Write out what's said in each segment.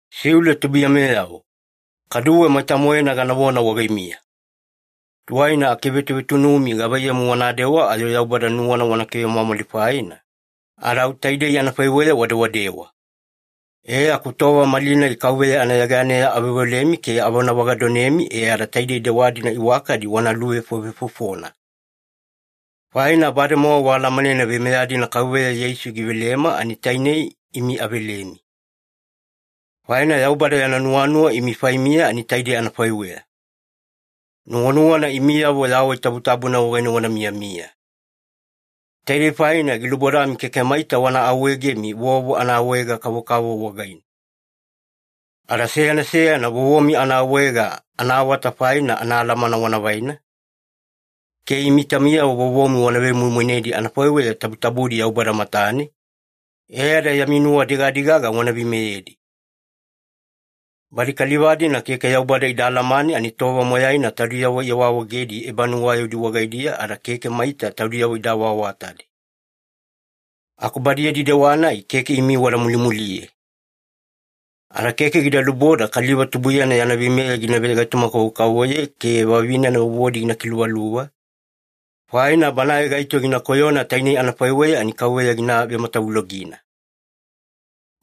Siule tubuiyameyavo, kaduwe maita-moena ganavona wagaimiya. Tuwaina akivetuvetunumi gavaiyamu wanadewa ayo Yaubada nuwana wana kivemwamwali faina, ada au taidei anafaiweya wadewadewa. E aku tova malinai Kauveya anayeganeya aveoveolemi ke avonavagadonemi e ada taidei dewa-dina iwakadi wana luvefovefofona. Faina bademowa waalamanena veimeya-dina Kauveya Yeisu givelema ani tainei imi avelemi. Faina Yaubada yana nuwanuwa imi faimiya ani taidei anafaiweya. Nuwanuwana imiyavo yawai tabutabuna wagaine wana miyamiya. Taidei faina gilubodami keke maita wana awaawaegemi vovo anaawaega-kavokavovo wagaine. Ada seyana seyana vovomi anaawaega anaawata faina anaalamana wana vaina, ke imi taumiyavo vovomi wana vemoimoinedi anafaiweya tabutabudi Yaubada matane, e ada yami nuwa digadigaga wana veimeyedi. Badi kaliva-dina keke Yaubada ida alamane ani tova moyaina taudiyavo iawaawaegedi ebanuwayaudi wagaidiya ada keke maita taudiyavo ida awaawatadi. Aku badi yadi dewa-nai keke imi wada mulimuliye. Ada keke gida luboda kaliva tubuiyana yana veimeya gina vegaitoma-kavokavovoye ke vavinena vovodi gina kiluvaluva, faina banae gaito gina koyona tainei anafaiweya ani Kauveya gina vematavulogina.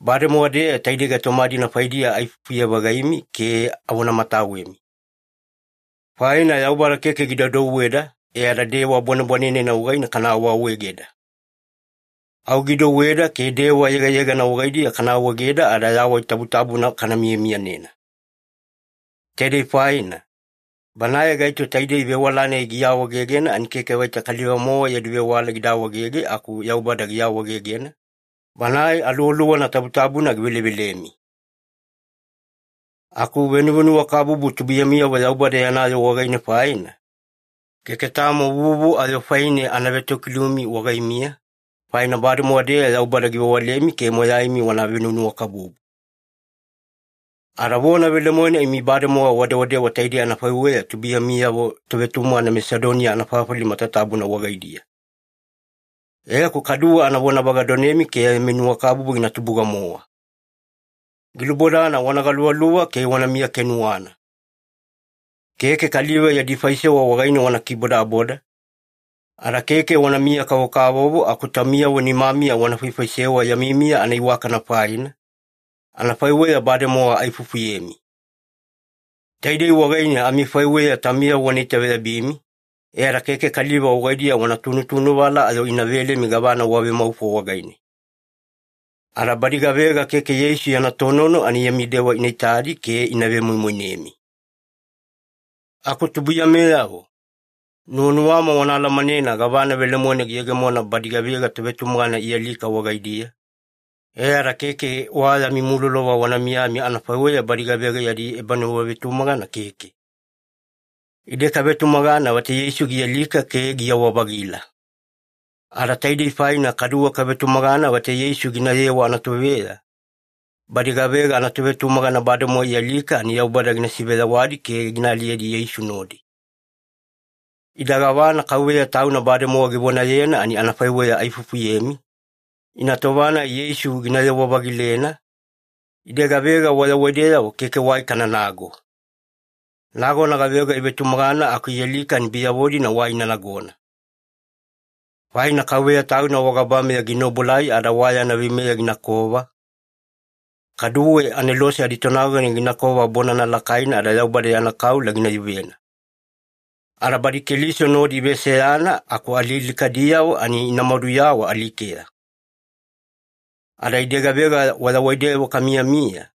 Bademowa-deya taidei gaitoma-dina faidiya aifufuye-vagaimi ke avonamatawemi. Faina Yaubada keke gida douweda e ada dewa bwanebwanenena wagaine kana awaawaegeda. Au gidouweda ke dewa yegayegana wagaidiya kana awaegeda e ada yawai tabutabuna kana miyamiyanena. Taidei faina, banae gaito taidei vewala-nai giawaegegena ani keke vaita kaliva-mowa yadi vewala gida awaegege aku Yaubada giawaegegena, Banae Aluwaluwana Tabutabuna givelevelemi. Aku venuwanuwakabubu tubuiyamiyavo Yaubada yana yoo wagaine faina, keke tamo vuvu ayo faine ana vetokilumi wagaimiya, faina bademowa-deya Yaubada givewalemi ke moyaimi wana venuwanuwakabubu. Ada vona velemoena imi bademowa wadewadewa taidei anafaiweya tubuiyamiyavo tovetumagana Masedoniya anafafali matatabuna wagaidiya. E aku kaduwe ana vonavagadonemi ke yami nuwakabubu gina tubuga-mowa. Gilubodana wana galuvaluva ke wanamiya kenuwana. Keke kaliva yadi faisewa wagaine wana kibodaboda, ada keke wanamiya-kavokavovo aku taumiyavo nimamiya wana faifaisewa yami miya anaiwakana faina, anafaiweya bademowa aifufuyemi. Taidei wagaine amifaiweya taumiyavo wana itaveyabimi, e ada keke kaliva wagaidiya wana tunutunuvala ayo ina velemi gavana wavemaufo wagaine. Ada badi gavega keke Yeisu yana tonono ani yami dewa ina itadi ke ina vemoimoinemi. Aku tubuiyameyavo, nuwanuwama wana alamanena gavana velemoena giyegemona badi gavega tovetumagana ialika wagaidiya, e ada keke wa yami mulolova wana miyami anafaiweya badi gavega yadi ebanuwavetumagana keke. Ide kavetumagana vaita Yeisu gialika ke giyawa-vagila. Ada taidei faina kaduwe kavetumagana vaita Yeisu ginayewa anatoveya, badi gavega anatovetumagana bademowa ialika ani Yaubada gina siveyawadi ke gina aliyedi Yeisu nodi. Ida gavana Kauveya Tauna bademowa givonayena ani anafaiweya aifufuyemi, ina tova-nai Yeisu ginayewa-vagilena, ide gavega wayawaideyavo keke wai kananago. Nagona gavega ivetumagana aku ialika ani biyavo-dina wai ina nagona. Faina Kauveya Tauna wagabameya gina obuelai ada wa yana veimeya ginakova, kaduwe anelose aditonagona ginakova bonana lakaina ada Yaubada yana kaula ina yuvena. Ada badi Keliso nodi iveseyana aku alialikadiyavo ani ina maduyawa alikeya. Ada ide gavega wayawaideyavo kamiyamiya,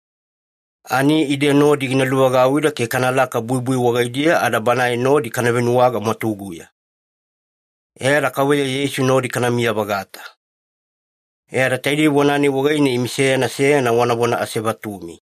ani ide nodi gina luvagauwida ke kanalaka buibui wagaidiya ada Banae nodi kana venuwaga mwatuguya. E ada Kauveya Yeisu nodi kanamiya-vagata. E ada taidei vona-nai wagaine imi seyana seyana wanavona asevatumi.